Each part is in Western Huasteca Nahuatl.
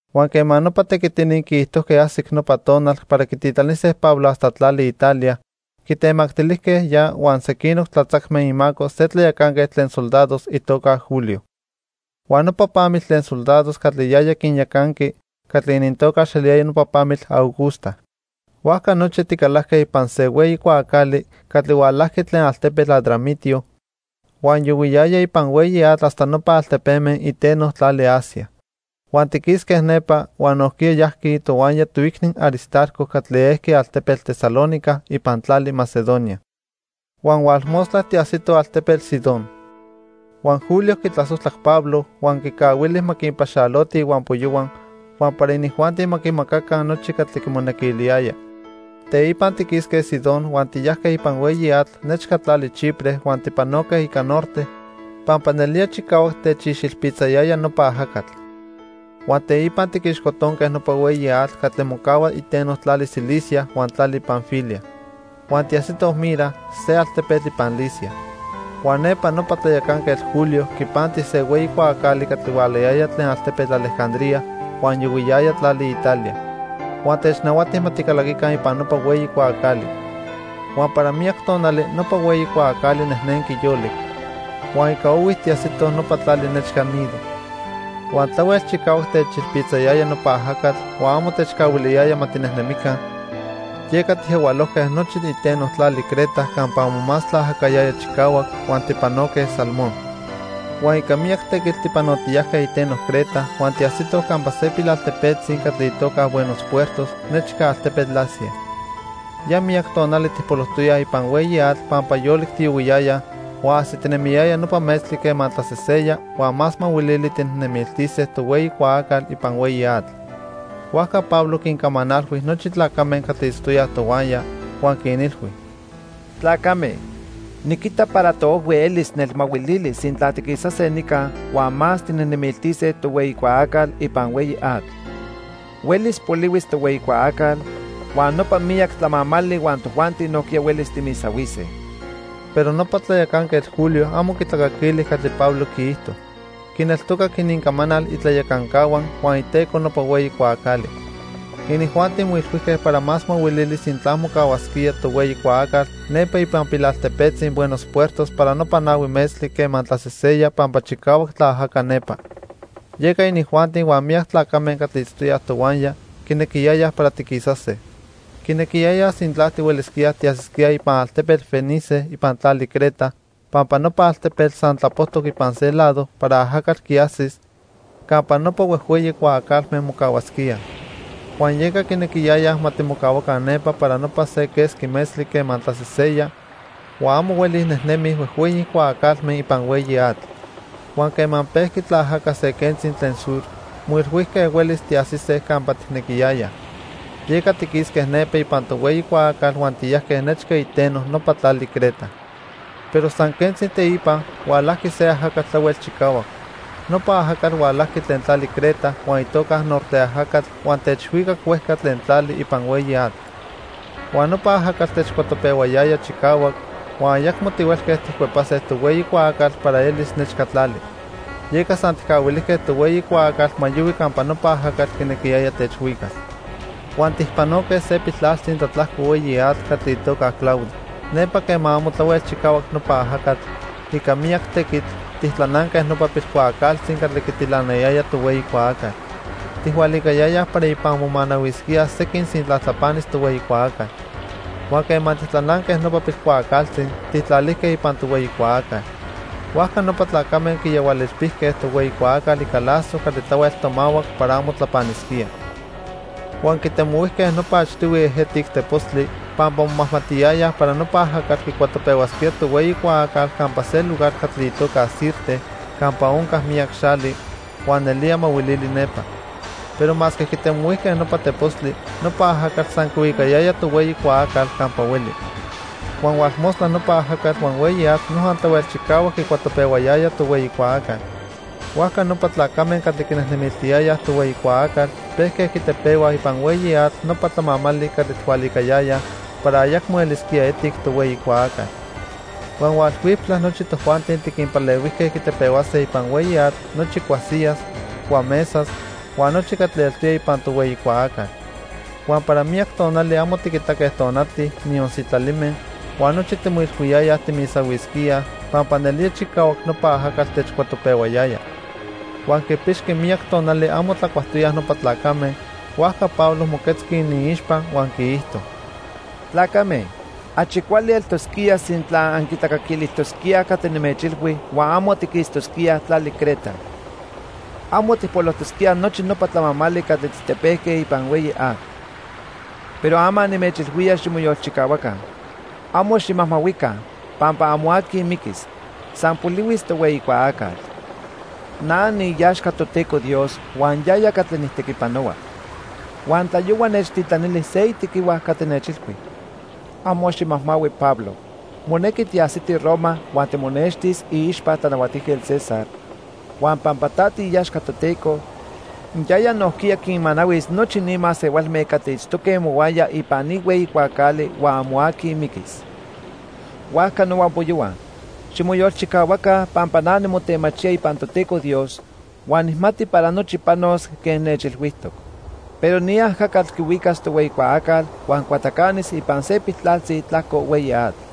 Huan quema nopa tequitini quiijtojque ajsic nopa tonal para quititlanise Pablo hasta tlali Italia, quitemactilijque ya huan sequinoc tlatzacme imaco se tlayacanquetl tlen soldados itoca Julio. Huan nopa pamitl tlen soldados catli yaya quinyacanqui catli inintocax eliyaya nopa Pamitl Augusta. Huajca nochi ticalajque ipan se hueyi cuaacali catli hualajqui tlen altepetl Adramitio huan yohuiyaya ipan hueyi atl hasta nopa altepeme iteno tlali Asia. Huan tiquisque nepa, huan nojquiya yajqui tohuaya toicni Aristarco catli ejqui altepetl Tesalónica ipan tlali Macedonia. Huan hualmostla tiajsitoj altepetl Sidón. Huan Julio quitlasojtlac Pablo, huan quicahuili ma quinpaxaloti ihuampoyohua huan para inijuanti ma quimacaca nochi catli quimonequiliyaya. Teipa tiquisque Sidón huan tiyajque ipan hueyi atl nechca tlali Chipre huan tipanoque ica norte pampa nelía chicahuac techixilpitzayaya nopa ajacatl. Huan teipa tiquixcotonque nopa hueyi atl catli mocahua iteno tlali Cilicia huan tlali Panfilia. Huan tiajsitoj Mira, se altepetl ipan Licia. Huan nepa nopa tlayacanquetl Julio quipanti se hueyi cuaacali catli hualayaya tlen altepetl Alejandría huan yohuiyaya tlali Italia, huan technahuati ma ticalaquica ipan nopa hueyi cuaacali. Huan para miyac tonali nopa hueyi cuaacali nejnenqui yolic, huan ica ohui tiajsitoj nopa tlali nechca Gnido. Huan tlahuel chicahuac techilpitzayaya nopa ajacatl huan amo techcahuiliyaya ma tinejnemica, yeca tijyahualojque nochi iteno tlali Creta campa amo más tlaajacayaya chicahuac huan tijpanoque Salmón. Huan ica miyac tequitl tipanotiyajque iteno Creta huan tiajsitoj campa se pilaltepetzi catli itoca Buenos Puertos nechca altepetl Lasea. Ya miyac tonali tijpolojtoyaj ipan hueyi atl pampa yolic tiyohuiyayaj huan ajsitinemiyaya nopa metztli quema tlaseseya huan más mahuilili tijnejnemiltise tohueyi cuaacal ipan hueyi atl. Huajca Pablo quincamanalhui nochi tlacame catli itztoyaj tohuaya, huan quinilhui: —Tlacame, niquita para toojhui elis nelmahuilili sintla tiquisase nica huan más tijnejnemiltise tohueyi cuaacal ipan hueyi atl. Huelis polihuis tohueyi cuaacal, huan nopa miyac tlamamali huan tojuanti nojquiya huelis timisahuise. Pero nopa tlayacanquetl Julio amo quitlacaquili catli Pablo quiijto. Quineltocac inincamanal itlayacancahua huan iteco nopa hueyi cuaacali. Inijuanti moilhuijque para más mahuilili sintla mocahuasquía tohueyi cuaacal nepa ipan pilaltepetzi Buenos Puertos para nopa nahui metztli quema tlaseseya pampa chicahuac tlaajaca nepa. Yeca inijuanti huan miyac tlacame catli itztoyaj tohuaya quinequiyayaj para tiquisase. Quinequiyayaj sintla tihuelisquíaj tiajsisquíaj ipan altepetl Fenice ipan tlali Creta pampa nopa altepetl san tlapojtoc ipan se lado para ajacatl quiajsis campa nopa huejhueyi cuaacalme mocahuasquíaj. Huan yeca quinequiyayaj ma timocahuaca nepa para nopa se quesqui metztli quema tlaseseya huan amo hueli nejnemij huejhueyi cuaacalme ipan hueyi atl. Huan quema pejqui tlaajaca se quentzi tlen sur, moilhuijque huelis tiajsise campa tijnequiyayaj. Yeca tiquisque nepa ipan tohueyi cuaacal huan tiyajque nechca iteno nopa tlali Creta. Pero san quentzi teipa, hualajqui se ajacatl tlahuel chicahuac. Nopa ajacatl hualajqui tlen tlali Creta huan itoca Norte ajacatl huan techhuicac huejca tlen tlali ipan hueyi atl. Huan nopa ajacatl techcuatopehuayaya chicahuac, huan ayacmo tihuelque tijcuepase tohueyi cuaacal para elis nechca tlali. Yeca san tijcahuilijque tohueyi cuaacal ma yohui campa nopa ajacatl quinequiyaya techhuicas. Huan tijpanoque se piltlaltzi tlatlajco hueyi atl catli itoca Clauda. Nepa quema amo tlahuel chicahuac nopa ajacatl, ica miyac tequitl, tijtlananque nopa pilcuaacaltzi catli quitilanayaya tohueyi cuaacal. Tijhualicayayaj para ipan momanahuisquíaj sequin sintla tlapanis tohueyi cuaacal. Huan quema tijtlananque nopa pilcuaacaltzi, tijtlalijque ipan tohueyi cuaacal. Huajca nopa tlacame quiyahualilpijque tohueyi cuaacal ica lazo catli tlahuel tomahuac para amo tlapanisquía. Huan quitemohuijque nopa achtihui ejetic tepostli, pampa momajmatiyayaj para nopa ajacatl quicuatopehuasquía tohueyi cuaacal campa se lugar catli itoca Sirte campa onca miyac xali, huan nelía mahuilili nepa. Pero masque quitemohuijque nopa tepostli, nopa ajacatl san quihuicayaya tohueyi cuaacal campa hueli. Huan hualmostla nopa ajacatl huan hueyi atl noja tlahuel chicahuac quicuatopehuayaya tohueyi cuaacal. Huajca nopa tlacame catli quinejnemiltiyayaj tohueyi cuaacal pejque quitepehuaj ipan hueyi atl nopa tlamamali catli tijhualicayayaj para ayacmo elisquía etic tohueyi cuaacal. Huan hualhuiptla nochi tojuanti tiquinpalehuijque quitepehuase ipan hueyi atl nochi cuasiyas, cuamesas, huan nochi catli eltoya ipan tohueyi cuaacal. Huan para miyac tonali amo tiquitaque tonati, niyon sitlalime, huan nochi timoilhuiyayaj timisahuisquíaj pampa nelía chicahuac nopa ajacatl techcuatopehuayaya. Huan quipixqui miyac tonali amo tlacuajtoyaj nopa tlacame, huajca Pablo moquetzqui iniixpa huan quiijto: —Tlacame, achi cuali eltosquía sintla anquitlacaquilijtosquíaj catli nimechilhui huan amo tiquistosquíaj tlali Creta. Amo tijpolojtosquíaj nochi nopa tlamantli catli tijtepejque ipan hueyi atl. Pero ama nimechilhuía ximoyolchicahuaca, amo ximajmahuica pampa amo aqui miquis, san polihuis tohueyi cuaacal. Na niiaxca Toteco Dios huan yaya catli nijtequipanohua. Huan tlayohua nechtitlanili se itequihua catli nechilhui: 'Amo ximajmahui, Pablo, monequi tiajsiti Roma huan timonextis iixpa Tlanahuatijquetl César, huan pampa ta tiiaxca Toteco, yaya nojquiya quinmanahuis nochi ni masehualme catli itztoque mohuaya ipan ni hueyi cuaacali huan amo aqui miquis.' Huajca nohuampoyohua, ximoyolchicahuaca pampa na nimotemachía ipan Toteco Dios huan nijmati para nochi panos quen nechilhuijtoc. Pero ni ajacatl quihuicas tohueyi cuaacal huan cuatacanis ipan se piltlaltzi tlajco hueyi atl.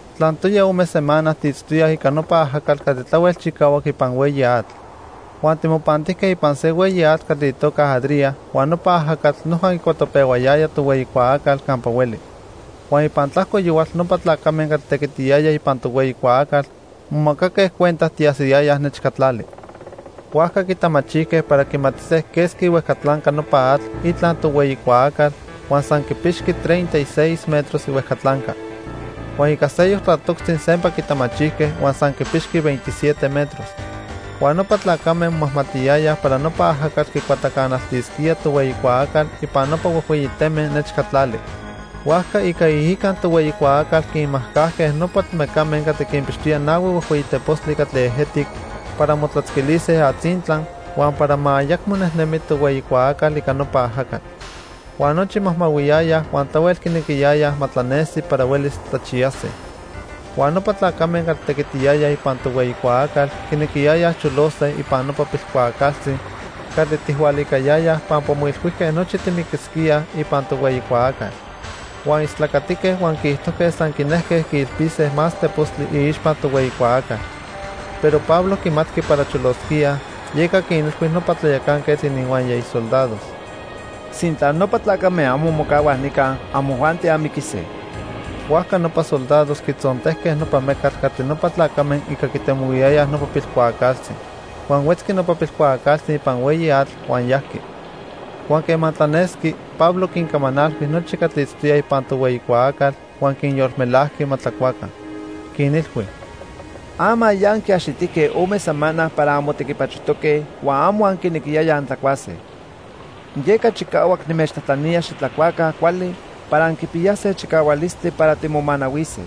Tlantoya ome semana tiitztoyaj ica nopa ajacatl catli tlahuel chicahuac ipan hueyi atl. Huan timopantijque ipan se hueyi atl catli itoca Adria huan nopa ajacatl noja quicuatopehuayaya tohueyi cuaacal campa hueli. Huan ipan tlajco yohual nopa tlacame catli tequitiyayaj ipan tohueyi cuaacal momacaque cuenta tiajsiyayaj nechca tlali. Huajca quitamachijque para quimatise quesqui ihuejcatlanca nopa atl itla tohueyi cuaacal, huan san quipixqui treinta y seis metros ihuejcatlanca. Huan ica seyoc tlatoctzi sempa quitamachijque huan san quipixqui veintisiete metros. Huan nopa tlacame momajmatiyayaj para nopa ajacatl quicuatacanaltisquía tohueyi cuaacal ipan nopa huejhueyi teme nechca tlali. Huajca ica iica tohueyi cuaacal quinmajcajque nopa mecame catli quinpixtoyaj nahui huejhueyi tepostli catli ejetic para motlatzquilise atzintla huan para ma ayacmo nejnemi tohueyi cuaacal ica nopa ajacatl. Huan nochi majmahuiyayaj huan tlahuel quinequiyayaj ma tlanesi para huelis tlachiyase. Huan nopa tlacame catli tequitiyayaj ipan tohueyi cuaacal quinequiyayaj cholose ipan nopa pilcuaacaltzi catli tijhualicayayaj pampa moilhuijque nochi timiquisquíaj ipan tohueyi cuaacal. Yeca quitemohuijque nopa pilcuaacaltzi ipan hueyi atl, huan istlacatique huan quiijtojque san quinejque quiilpise más tepostli iixpa tohueyi cuaacal. Pero Pablo quimatqui para cholosquíaj, yeca quinilhui nopa tlayacanquetl ininhuaya isoldados: —Sintla nopa tlacame amo mocahuaj nica, amojuanti anmiquise. Huajca nopa soldados quitzontejque nopa mecatl catli nopa tlacame ica quitemohuiyayaj nopa pilcuaacaltzi. Huan huetzqui nopa pilcuaacaltzi ipan hueyi atl huan yajqui. Huan quema tlanesqui, Pablo quincamanalhui nochi catli itztoyaj ipan tohueyi cuaacal huan quinyolmelajqui ma tlacuaca. Quinilhui: —Ama ya anquiaxitijque ome semana para anmotequipachojtoque huan amo anquinequiyayaj antlacuase. Yeca chicahuac nimechtlajtlanía xitlacuaca cuali para anquipiyase chicahualistli para timomanahuise.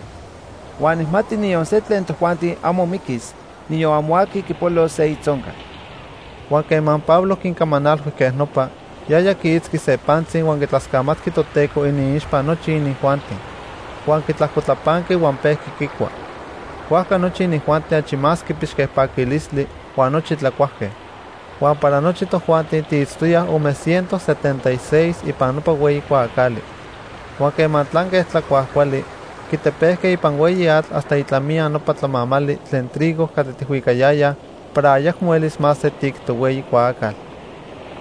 Huan nijmati niyon se tlen tojuanti amo miquis, niyon amo aqui quipolos se itzoncal. Huan quema Pablo quincamanalhui quej nopa, yaya quiitzqui se pantzi huan quitlascamatqui Toteco iniixpa nochi inijuanti. Huan quitlajcotlapanqui huan pejqui quicua. Huajca nochi inijuanti achi más quipixque paquilistli, huan nochi tlacuajque. Huan para nochi tojuanti tiitztoyaj ome ciento setenta y seis ipan nopa hueyi cuaacali. Huan quema tlanque tlacuaj cuali, quitepejque ipan hueyi atl hasta itlamiya nopa tlamamali tlen trigo catli tijhuicayayaj para ayacmo elis más etic tohueyi cuaacal.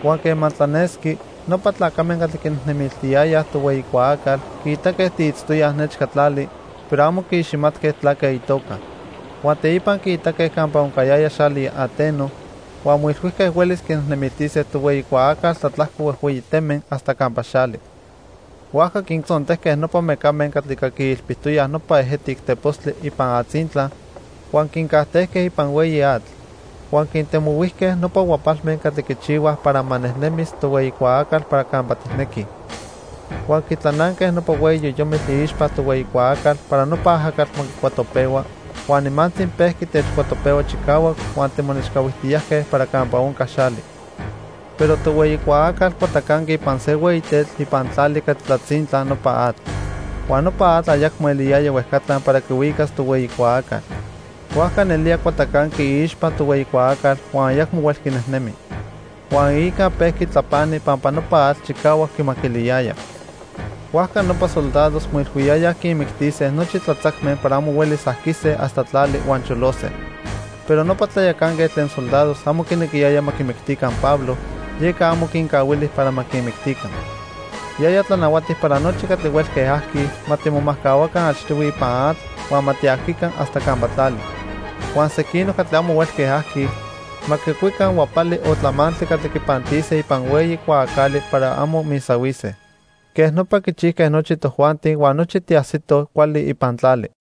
Huan quema tlanesqui, nopa tlacame catli quinejnemiltiyayaj tohueyi cuaacal quiitaque tiitztoyaj nechca tlali, pero amo quiiximatque tlaque itoca. Huan teipa quiitaque campa oncayaya xali ateno, huan moilhuijque huelis quinejnemiltise tohueyi cuaacal tlatlajco huejhueyi teme hasta campa xali. Huajca quintzontejque nopa mecame catli ica quiilpijtoyaj nopa ejetic tepostli ipan atzintla, huan quincajtejque ipan hueyi atl. Huan quintemohuijque nopa huapalme catli quichihuaj para ma nejnemis tohueyi cuaacal para campa tijnequij. Huan quitlananque nopa hueyi yoyomitl iixpa tohueyi cuaacal para nopa ajacatl ma quicuatopehua, huan nimantzi pejqui techcuatopehua chicahuac huan timonechcahuijtiyajque para campa onca xali. Pero tohueyi cuaacal cuatacanqui ipan se hueyi tetl ipan tlali catli tlatzintla nopa atl. Huan nopa atl ayacmo eliyaya huejcatla para quihuicas tohueyi cuaacal. Huajca nelía cuatacanqui iixpa tohueyi cuaacal huan ayacmo huelqui nejnemi. Huan iica pejqui tlapani pampa nopa atl chicahuac quimaquiliyaya. Huajca nopa soldados moilhuiyayaj quinmictise nochi tlatzacme para amo huelis ajquise hasta tlali huan cholose. Pero nopa tlayacanquetl tlen soldados amo quinequiyaya ma quimictica Pablo, yeca amo quincahuili para ma quinmictica. Yaya tlanahuati para nochi catli huelque ajquij ma timomajcahuaca achtihui ipan atl huan ma tiajquica hasta campa tlali. Huan sequinoc catli amo huelque ajquij ma quicuica huapali o tlamantli catli quipantise ipan hueyi cuaacali para amo misahuise. Quej nopa quichijque nochi tojuanti huan nochi tiajsitoj cuali ipan tlali.